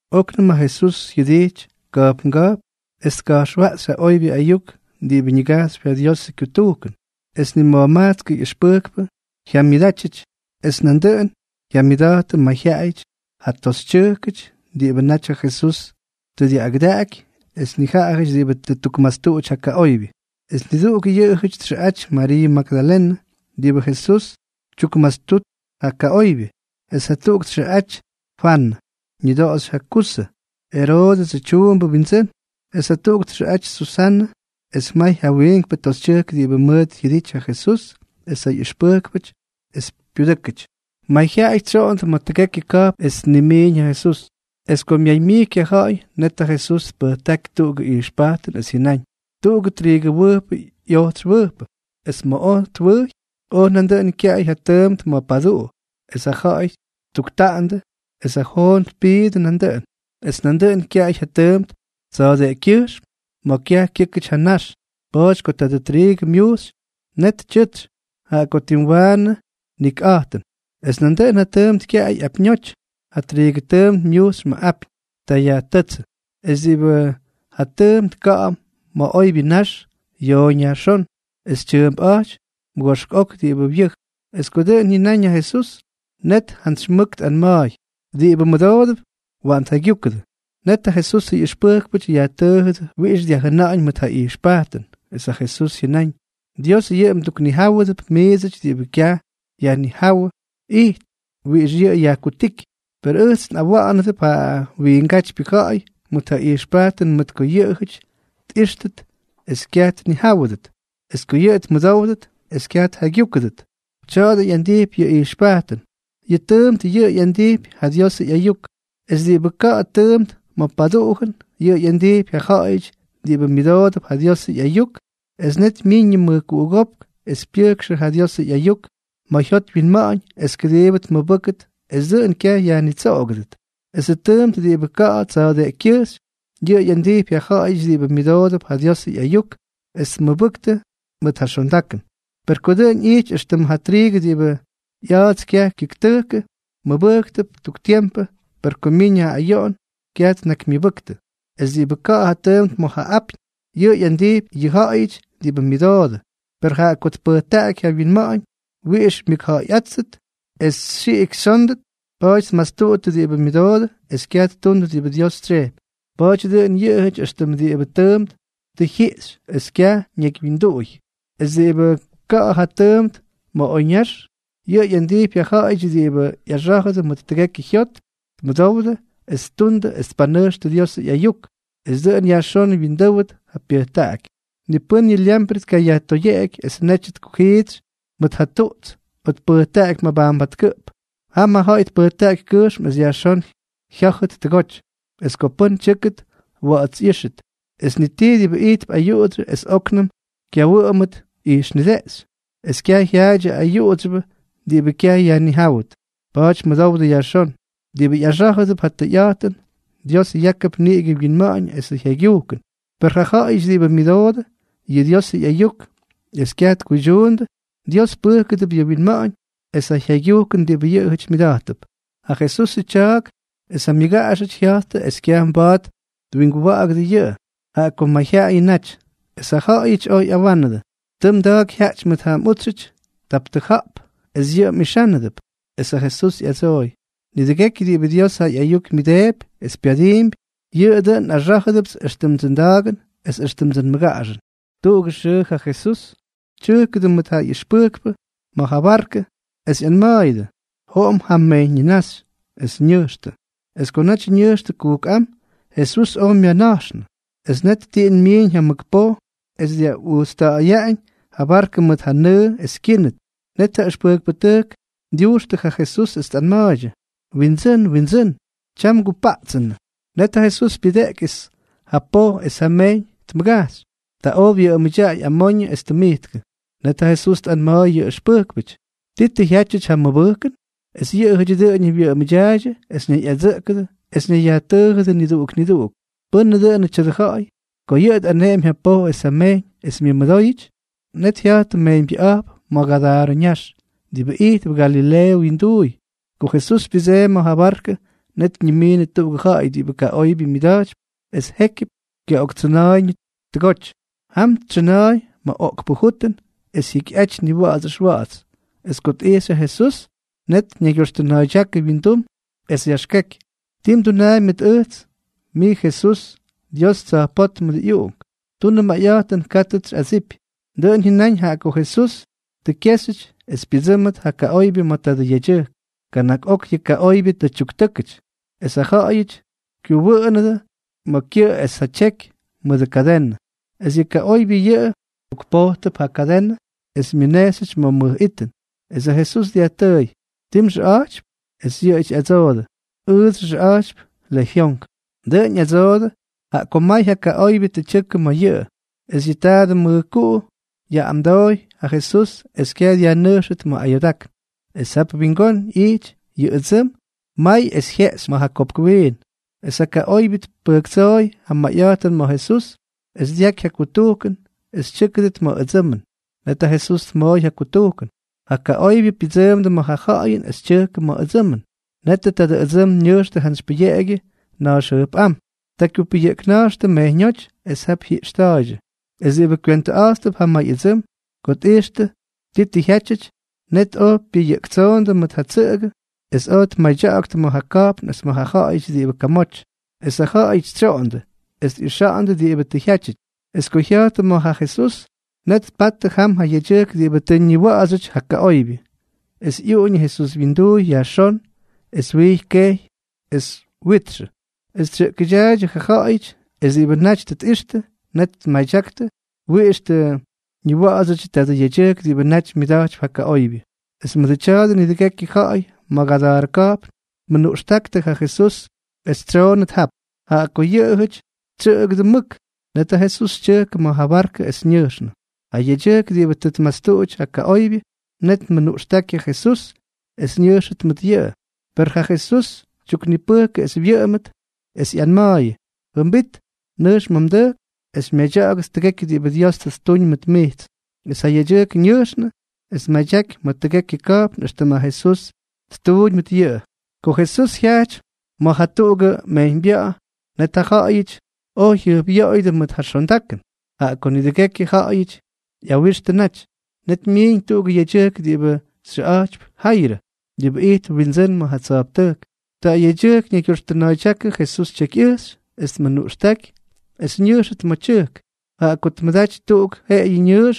Oknʉm ja Jesús jyʉdijty ka̱jpnga̱jpn es tka̱jxwaꞌxy ja oybyʉ ayuk diꞌibʉ ñigajxypy ja Diosʉ kyutujkʉn. Es nima̱jmajtskʉ ꞌyʉxpʉjkpʉ jyamyʉdátyʉty. Es nandʉꞌʉn jyamyʉda̱jtʉdʉ nijaꞌajʉty ja toxytyʉjk diꞌibʉ naty ja Jesús tʉ dyaꞌꞌagʉdaꞌaky es nijaꞌajʉty diꞌibʉ tʉ ttukmastuꞌuty ja kaꞌoybyʉ. Es niduꞌuk yʉꞌʉjʉty txʉꞌaty Mariiʉ Magdalenʉ, diꞌibʉ Jesús tyukmastut jʉxtujk ja kaꞌóybyʉty, es jatuꞌuk txʉꞌaty Fwanʉ, ñʉdoꞌoxy ja Kuzʉ, Eroodʉsʉ tyuumbʉ wyindsʉ́n, es jatuꞌuk txʉꞌaty Susanʉ, es may ja wiinkpʉ toxytyʉjk diꞌibʉ mʉʉt jyʉdijty ja Jesús es ja ꞌyʉxpʉjkpʉty es pyudʉ́kʉty. Mayjyaꞌay tsyoꞌondʉ ma̱ tʉgekyʉ ka̱jpn es tnimiiñ ja Jesús. Es ko myaymyijky ja ja̱ꞌa̱y, net ja Jesús tpʉjtáky tuꞌugʉ ijxpajtʉn es jyʉnáñ: —Tuꞌugʉ triigʉwʉjpʉ ꞌyojtsy wʉjpʉ. Es ma̱ oj twʉjy, oj nandʉꞌʉn kyaꞌay ja tyʉʉmt ma̱ paduꞌu, es ja ja̱ꞌa̱y ttuktaꞌandʉ, es ja joon tpiidʉ nandʉꞌʉn. Es nandʉꞌʉn kyaꞌay ja tyʉʉmt tsa̱a̱deꞌekykyʉjxm ma̱ kyaj kyʉ́kʉty ja nax. Pa̱a̱ty ko tadʉ triigʉ myujxy, net tyʉtsy, jaꞌa ko tim waanʉ nikꞌa̱jtʉn. Es nandʉꞌʉn ja tʉʉmt kyaꞌay apyñoty. Ja triigʉ tʉʉmt myujxy ma̱ apyñ. Ta yajtʉ́tsʉ. Es diꞌibʉ ja tʉʉmt ka̱ꞌa̱ ma̱ oybyʉ nax, yooñ yajxón, es tyʉʉmpꞌa̱jty mʉgoꞌpx ok diꞌibʉ wyʉj. Es ko dʉꞌʉn jyʉnáñ ja Jesús, net jantsy mʉk tꞌanma̱a̱y: —Diꞌibʉ mʉdoodʉp, waꞌan tjaygyúkʉdʉ. Net ja Jesusʉ ꞌyʉxpʉjkpʉty yajtʉʉjʉdʉ wiꞌix dyajjʉna̱ꞌa̱ñ mʉt ja ꞌyijxpajtʉn. Es ja Jesús jyʉnáñ: —Dios yʉꞌʉ mduknijáwʉdʉp miidsʉty diꞌibʉ kyaj yajnijáwʉ ijty wiꞌix yʉꞌʉ yajkutíky. Per ʉjts nꞌawa̱ꞌa̱nʉp ja wiingátypyʉ ja̱ꞌa̱y mʉt ja ijxpajtʉn mʉt ko yʉꞌʉjʉty tꞌíxtʉt es kyaj tnijáwʉdʉt, es ko yʉꞌʉ tmʉdówdʉt es kyaj tjaygyúkʉdʉt. ’Tya̱a̱dʉ ꞌyandijpy yʉ ijxpajtʉn: Yʉ tʉʉmt yʉꞌʉ ꞌyandijpy ja Diosʉ ꞌyayuk. Es diꞌibʉ ka̱ꞌa̱ ja tʉʉmt ma̱ paduꞌujʉn, yʉꞌʉ ꞌyandijpy yʉ ja̱ꞌa̱yʉty diꞌibʉ myʉdoodʉp ja Diosʉ ꞌyayuk, es net myiiñ yʉ mʉjkuꞌugópk es pyʉjkxʉ ja Diosʉ ꞌyayuk ma̱ jyot wyinma̱ꞌa̱ñ es kʉdiibʉ tmʉbʉ́ktʉt es dʉꞌʉn kyaj yajnitsoꞌogʉdʉt. Esʉ tʉʉmt diꞌibʉ ka̱ꞌa̱ tsa̱a̱deꞌekykyʉjxy, yʉꞌʉ ꞌyandijpy ja ja̱ꞌa̱yʉty diꞌibʉ myʉdoodʉp ja Diosʉ ꞌyayuk es tmʉbʉktʉ mʉt ja xondakʉn. Per ko dʉꞌʉn ꞌyittʉ éxtʉm ja triigʉ diꞌibʉ ꞌya̱a̱ts kyaj kyʉktʉkʉ, mʉbʉjktʉp tuk tiempʉ, per ko myiñ ja ayoꞌon, kyaj tnakymyʉbʉktʉ. Es diꞌibʉ ka̱ꞌa̱ ja tʉʉmt ma̱ ja apyñ, yʉꞌʉ ꞌyandijpy yʉ ja̱ꞌa̱yʉty diꞌibʉ myʉdoodʉ, per jaꞌa ko tpʉjtaꞌaky ja wyinma̱ꞌa̱ñ wiꞌix myʉkja̱ꞌa̱yꞌáttʉt es xyiꞌik xyónʉt, pa̱a̱ty tmastuꞌuttʉ diꞌibʉ myʉdoodʉ es kyaj ttundʉ diꞌibʉ Dios tsyejpy. Pa̱a̱ty dʉꞌʉn yʉꞌʉjʉty éxtʉm diꞌibʉ tʉʉmt tʉ jyiꞌxy es kyaj tʉ ñakywyindʉy. ’Es diꞌibʉ ka̱ꞌa̱ ja tʉʉmt ma̱ oyñax, yʉꞌʉ ꞌyandijpy ja ja̱ꞌa̱yʉty diꞌibʉ ꞌyaxá̱jʉdʉ mʉt tʉgekyʉ jyot, tmʉdowdʉ es ttundʉ es tpanʉjxtʉ Diosʉ ꞌyayuk. Es dʉꞌʉn yajxón wyindʉ́wʉt ja pyʉjtaꞌaky. ’Ni pʉ́n yʉ lyamprʉ tkayajtoyeꞌeky es netyʉ tkujiitsy mʉt ja tuꞌts o tpʉjtaꞌaky mabajnbatkʉꞌp. Jam ja ja̱ꞌa̱y tpʉjtaꞌaky kʉjxm es yajxón jyá̱jʉt tʉgoty, es ko pʉ́n tyʉ́kʉt, wa̱ꞌa̱ts ꞌyíxʉt. Es ni tii diꞌibʉ ijtp ayuꞌudsyʉ es óknʉm kyawʉꞌʉmʉt ijxnideꞌxy, es kyaj jyaadyʉ ayuꞌudsyʉbʉ diꞌibʉ kyaj yajnijáwʉt. Pa̱a̱ty mʉdowdʉ yajxón. Diꞌibʉ ꞌyaxá̱jʉdʉp ja tʉyꞌa̱jtʉn, Dios yákʉp niꞌigʉ winma̱ꞌa̱ñ esʉ jaygyujkʉn, per ja ja̱ꞌa̱yʉty diꞌibʉ myʉdoodʉ ja Diosʉ ꞌyayuk es kyaj tkuydyundʉ, Dios pʉjkʉdʉp ja wyinma̱ꞌa̱ñ es ja jyaygyujkʉn diꞌibʉ yʉꞌʉjʉty myʉda̱jttʉp. Ja Jesusʉ tya̱a̱k es ja myʉgaꞌaxʉty jya̱jttʉ es kyaj mba̱a̱t twinguwa̱ꞌa̱gʉdʉ yʉꞌʉ, jaꞌa ko mayjyaꞌayʉ naty. Es ja ja̱ꞌa̱yʉty oj ꞌyawánʉdʉ: —Tʉ mda̱a̱k jyaꞌty mʉt ja mꞌútsyʉty tap tʉja̱ꞌp, es yʉꞌʉ mꞌixánʉdʉp. Es ja Jesús ꞌyadsooy: —Nidʉgekyʉ diꞌibʉ Dios ja ꞌyayuk myʉdeepy es pyadiimpy, yʉꞌʉ dʉꞌʉn nꞌaxá̱jʉpts éxtʉmdsʉ nda̱a̱gʉn es éxtʉmdsʉ nmʉgaꞌaxʉn. Tuꞌugʉ xʉʉ ja Jesús tyʉjkʉdʉ mʉt ja ꞌyʉxpʉjkpʉ ma̱ ja barkʉ, es ꞌyanma̱a̱yʉdʉ: —Joꞌom jam mejyñ ñinaxy. Es ñʉjxtʉ. Es ko naty ñʉjxtʉ kujkꞌám, Jesús oj myana̱jxnʉ. Es net tiꞌin myiiñ ja mʉk poj es dyaꞌujtsta̱ꞌa̱yaꞌañ ja barkʉ mʉt ja nʉʉ es kyínʉt. Net ja ʉxpʉjkpʉtʉjk dyujxtʉ ja Jesús es tꞌanma̱a̱ydyʉ: —¡Windsʉ́n, Windsʉ́n! ¡Tyam ngupaꞌtsta̱ꞌa̱yʉnʉ! Net ja Jesús pyʉdeꞌky es ja poj es ja mejyñ tmʉgajxy. Ta oj wyʉꞌʉmʉdyaꞌay amoñʉ es tʉmijtkʉ. Net ja Jesús tꞌanma̱a̱y ja ꞌyʉxpʉjkpʉty: —¿Ti tʉ jyátyʉty ja mmʉbʉjkʉn? Es yʉꞌʉjʉty dʉꞌʉñʉ wyʉꞌʉmʉdyaaydyʉ es ñayꞌadsʉꞌkʉdʉ es ñayyajtʉʉjʉdʉ niduꞌuk niduꞌuk: —¿Pʉ́nʉ dʉꞌʉnʉ tya̱dʉ ja̱ꞌa̱y?, ko yʉꞌʉ tꞌaneꞌemy ja poj es ja mejyñ, es myʉmʉdóyʉty. Net jya̱jttʉ mejyñbyʉꞌa̱jp ma̱ Gadarʉ ñax, diꞌibʉ ijtp Galileeʉ wyinduuy. Ko Jesús pyʉdseemy ma̱ ja barkʉ, net ñimiinʉ tuꞌugʉ ja̱ꞌa̱y diꞌibʉ kaꞌoybyʉ myʉda̱jtypy es jékyʉp kyaꞌoktsʉna̱a̱yñʉ tʉgoty. Jam tsʉna̱a̱y ma̱ oꞌkpʉ jutʉn es jyikyꞌaty niwa̱ꞌa̱ts ʉxwa̱ꞌa̱ts. Es ko tꞌijxy ja Jesús, net ñaygyoxtʉna̱a̱ydyákʉ wyindum es yaxkeky: —¿Ti mdunaampy mʉt ʉjts?, mij Jesús, Dios Tsa̱jpótmʉdʉ ꞌyUꞌunk. Tunʉ mayꞌa̱jtʉn, kátʉts xyꞌadsipy. Dʉꞌʉn jyʉnáñ jaꞌa ko Jesús tʉ kyéxyʉty es pyʉdsʉ́mʉt ja kaꞌoybyʉ ma̱ tadʉ yedyʉjk. Kana̱k ok yʉ kaꞌoybyʉ tʉ tyuktʉ́kʉty, es ja ja̱ꞌa̱yʉty kyuwʉʉnʉdʉ ma̱ kyʉꞌʉ es ja tyeky mʉt ja kadenʉ. Es yʉ kaꞌoybyʉ yʉꞌʉ tukpojtʉp ja kadenʉ es myʉnejxyʉty ma̱ mʉj itʉn. Es ja Jesús dyajtʉʉy: —¿Ti mxʉꞌa̱jtypy? Es yʉꞌʉ ꞌyadsoojʉ: —Ʉjts nxʉꞌa̱jtypy Lejyonk. Dʉꞌʉn ꞌyadsoojʉ, jaꞌa ko may ja kaꞌoybyʉ tʉ tyʉkʉ ma̱ yʉꞌʉ. Es yʉ tadʉ mʉjkuꞌu yaꞌꞌamdooy ja Jesús es kyaj dyajnʉjxʉt ma̱ ayoodákn. Es jap wingón ꞌyijty yʉ ʉdsʉm may es jyeꞌxy ma̱ ja kopk wiin. Es ja kaꞌoybyʉ tpʉjktsooy ja mayꞌa̱jtʉn ma̱ Jesús es dyaky ja kutujkʉn es tyʉ́kʉdʉt ma̱ ʉdsʉmʉn. Net ja Jesús tmooy ja kutujkʉn. Ja kaꞌoybyʉ pyʉdsʉʉmdʉ ma̱ ja ja̱ꞌa̱yʉn es tyʉjkʉdʉ ma̱ ʉdsʉmʉn. Netʉ tadʉ ʉdsʉm ñʉjxtʉ jantsy pʉyeꞌegyʉ nax jʉjpꞌám. Ta kyupʉyʉꞌkna̱jxtʉ mejyñóty, es jap jyiꞌxta̱a̱ydyʉ. Es diꞌibʉ kywentʉꞌa̱jttʉp ja may ʉdsʉm, ko tꞌijxtʉ ti tʉ jyátyʉty, net oj pyʉyʉꞌktsoondʉ mʉt ja tsʉꞌʉgʉ es oj tmadya̱ꞌa̱ktʉ ma̱ ja ka̱jpn es ma̱ ja̱ꞌa̱yʉty diꞌibʉ kamoty. Es ja ja̱ꞌa̱yʉty tsyoꞌondʉ es tꞌixa̱ꞌa̱ndʉ diꞌibʉ tʉ jyátyʉty. Es ko jya̱jttʉ ma̱ ja Jesús, net tpattʉ jam ja yedyʉjk diꞌibʉ tʉ ñiwa̱ꞌa̱dsyʉty ja kaꞌoybyʉ, es ꞌyuꞌuñʉ Jesús wyinduuy yajxón es wijy kejy es witxʉ. Es tsyʉꞌkʉdyaaydyʉ ja ja̱ꞌa̱yʉty. Es diꞌibʉ naty tʉ tꞌixtʉ, net tmadyaktʉ wiꞌix tʉ ñiwa̱ꞌa̱dsyʉdyʉ tadʉ yedyʉjk diꞌibʉ naty myʉda̱jtypy ja kaꞌoybyʉ. Es mʉdʉ tya̱a̱dʉ nidʉgekyʉ ja̱ꞌa̱y ma̱ Gadarʉ ka̱jpn tmʉnuꞌxtáktʉ ja Jesús es tsyoꞌonnʉt jap, jaꞌa ko yʉꞌʉjʉty tsyʉꞌkʉdʉ mʉk. Net ja Jesús tyʉjkʉ ma̱ ja barkʉ es ñʉjxnʉ. Ja yedyʉjk diꞌibʉ tʉ myastuꞌudyʉty ja kaꞌoybyʉ, net tmʉnuꞌxtáky ja Jesús es ñʉjxʉt mʉt yʉꞌʉ. Per ja Jesús tyuknipʉjkʉ es wyʉꞌʉmʉt, es ꞌyanma̱a̱yʉ: —Jʉmbit. Nʉjx ma̱ mdʉjk es xymyadya̱ꞌa̱gʉt tʉgekyʉ diꞌibʉ Dios tʉ ttuñ mʉt mijts. Es ja yedyʉjk ñʉjxnʉ es tmadyaky ma̱ tʉgekyʉ ka̱jpn éxtʉm ja Jesús ttuuñ mʉt yʉꞌʉ. Ko Jesús jyajty ma̱ jatuꞌugʉ mejyñbya̱ꞌa̱, net ja ja̱ꞌa̱yʉty oj jyʉjpꞌyoꞌoyʉdʉ mʉt ja xondakʉn, jaꞌa ko nidʉgekyʉ ja̱ꞌa̱yʉty ꞌyawixtʉ naty. Net myiiñ tuꞌugʉ yedyʉjk diꞌibʉ xyʉꞌa̱jtypy Jayrʉ, diꞌibʉ ijtp windsʉ́n ma̱ ja tsa̱jptʉjk. Tadʉ yedyʉjk ñaygyoxtʉna̱a̱ydyákʉ Jesús tyekyꞌʉjxy es tmʉnuꞌxtáky es ñʉjxʉt ma̱ ja tyʉjk, jaꞌa ko tmʉdaty tuꞌuk jeꞌeyʉ ñʉʉx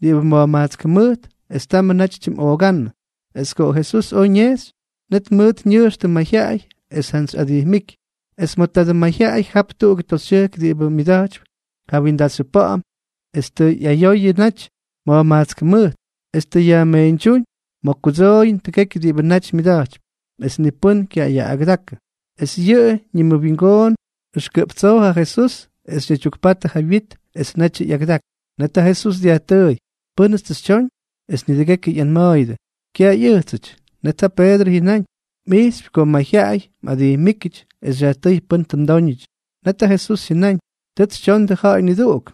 diꞌibʉ ma̱jmajtsk jʉmʉjt, es tamʉ naty tyimꞌoogánnʉ. Es ko Jesús oj ñejxy, net mʉʉt ñʉjxtʉ mayjyaꞌay es jantsy adijmíky. Es ma̱ tadʉ mayjyaꞌay jap tuꞌugʉ toxytyʉjk diꞌibʉ myʉda̱jtypy ja windaxyʉ pa̱ꞌa̱m es tʉ ꞌyayoyʉ naty ma̱jmajtsk jʉmʉjt, es tʉ yajmeeñdyúñ ma̱ kudsooyʉn tʉgekyʉ diꞌibʉ naty myʉda̱jtypy, es ni pʉ́n kyayaꞌꞌagʉdakʉ. Es yʉꞌʉ ñiwingoon ʉxkʉꞌp tsoo ja Jesús es ñaydyukpatʉ ja wyit, es netyʉ ꞌyagʉdaky. Net ja Jesús dyajtʉʉy: —¿Pʉ́nʉts tʉ xytyoñ? Es nidʉgekyʉ ꞌyanma̱a̱yʉdʉ: —Kyaj ꞌyʉjtsʉty. Net ja Peedrʉ jyʉnáñ: —Mꞌijxypy ko mayjyaꞌay mꞌadijmíkyʉty, es xyajtʉ́y pʉ́n tʉ mdóñʉty. Net ja Jesús jyʉnáñ: —Tʉts xytyondʉ ja̱ꞌa̱y niduꞌuk.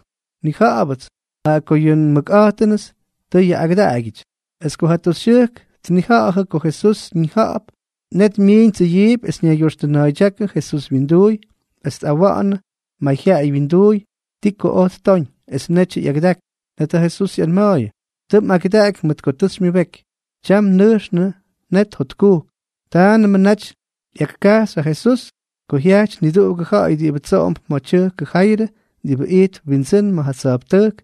Nnija̱ꞌa̱bʉts, jaꞌa ko yʉ nmʉkꞌa̱jtʉnʉts tʉ yaꞌꞌagʉdaꞌagyʉty. Es ko ja toxytyʉjk tnija̱ꞌa̱jʉ ko Jesús ñija̱ꞌa̱p, net myiiñ tsʉyiipy es ñaygyoxtʉna̱a̱ydyákʉ Jesús wyinduuy es tꞌawa̱ꞌa̱nʉ mayjyaꞌay wyinduuy ti ko oj ttoñ, es netyʉ ꞌyagʉdaky. Net ja Jesús ꞌyanma̱a̱yʉ: —Tʉ mꞌagʉdaꞌaky mʉt ko tʉ xymyʉbeky. Tyam nʉjxʉ net jotkujk. Támnʉmʉ naty ꞌyakkajxy ja Jesús ko jyajty niduꞌugʉ ja̱ꞌa̱y diꞌibʉ tsoꞌomp ma̱ tyʉjkʉ Jayrʉ diꞌibʉ ijtp windsʉ́n ma̱ ja tsa̱jptʉjk,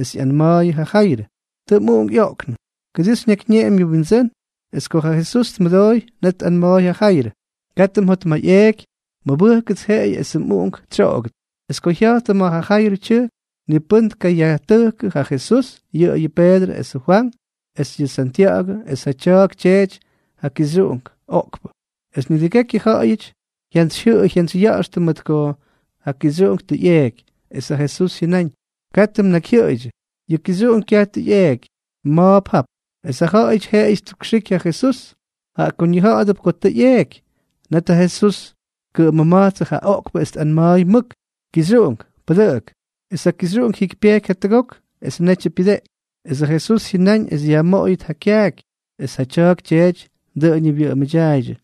es yaꞌꞌanma̱a̱y ja Jayrʉ: —Tʉ mꞌuꞌunk ꞌyoꞌknʉ. Kʉdii xyñakyñeꞌemy yʉ Windsʉ́n. Es ko ja Jesús tmʉdooy, net tꞌanma̱a̱y ja Jayrʉ: —Katʉ mjotmayꞌeeky. Mʉbʉjkʉts jeꞌeyʉ esʉ mꞌuꞌunk tsyoꞌogʉt. Es ko jya̱jttʉ ma̱ ja Jayrʉ tyʉjk, ni pʉ́n tkayajtʉjkʉ ja Jesús, yʉꞌʉyʉ Peedrʉ es ja Fwank es yʉ Santya̱ꞌa̱gʉ es ja tya̱a̱k tyeety ja kixyuꞌunk oꞌkpʉ. Es nidʉgekyʉ ja̱ꞌa̱yʉty jyantsyjyʉꞌʉy jyantsyya̱ꞌa̱xtʉ mʉt ko ja kixyuꞌunk tʉ ꞌyeeky. Es ja Jesús jyʉnáñ: —Katʉ mnakyjyʉꞌʉydyʉ. Yʉ kixyuꞌunk kyaj tʉ ꞌyeeky. Ma̱a̱p jap. Es ja ja̱ꞌa̱yʉty jeꞌeyʉ ttukxiky ja Jesús, jaꞌa ko ñija̱ꞌa̱dʉp ko tʉ ꞌyeeky. Net ja Jesús tkʉꞌʉmʉma̱jtsʉ ja oꞌkpʉ es tꞌanma̱a̱y mʉk: —Kixyuꞌunk, pʉdʉꞌʉk. Es ja kixyuꞌunk jyikypyejky jatʉgok es netyʉ pyʉdeꞌky. Es ja Jesús jyʉnáñ es yajmoꞌoyʉt ja kyaaky. Es ja tya̱a̱k tyeety dʉꞌʉñʉ wyʉꞌʉmʉdyaaydyʉ.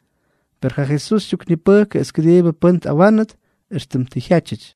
Per ja Jesús tyuknipʉjkʉ es kʉdiibʉ pʉ́n tꞌawánʉt éxtʉm tʉ jyaty.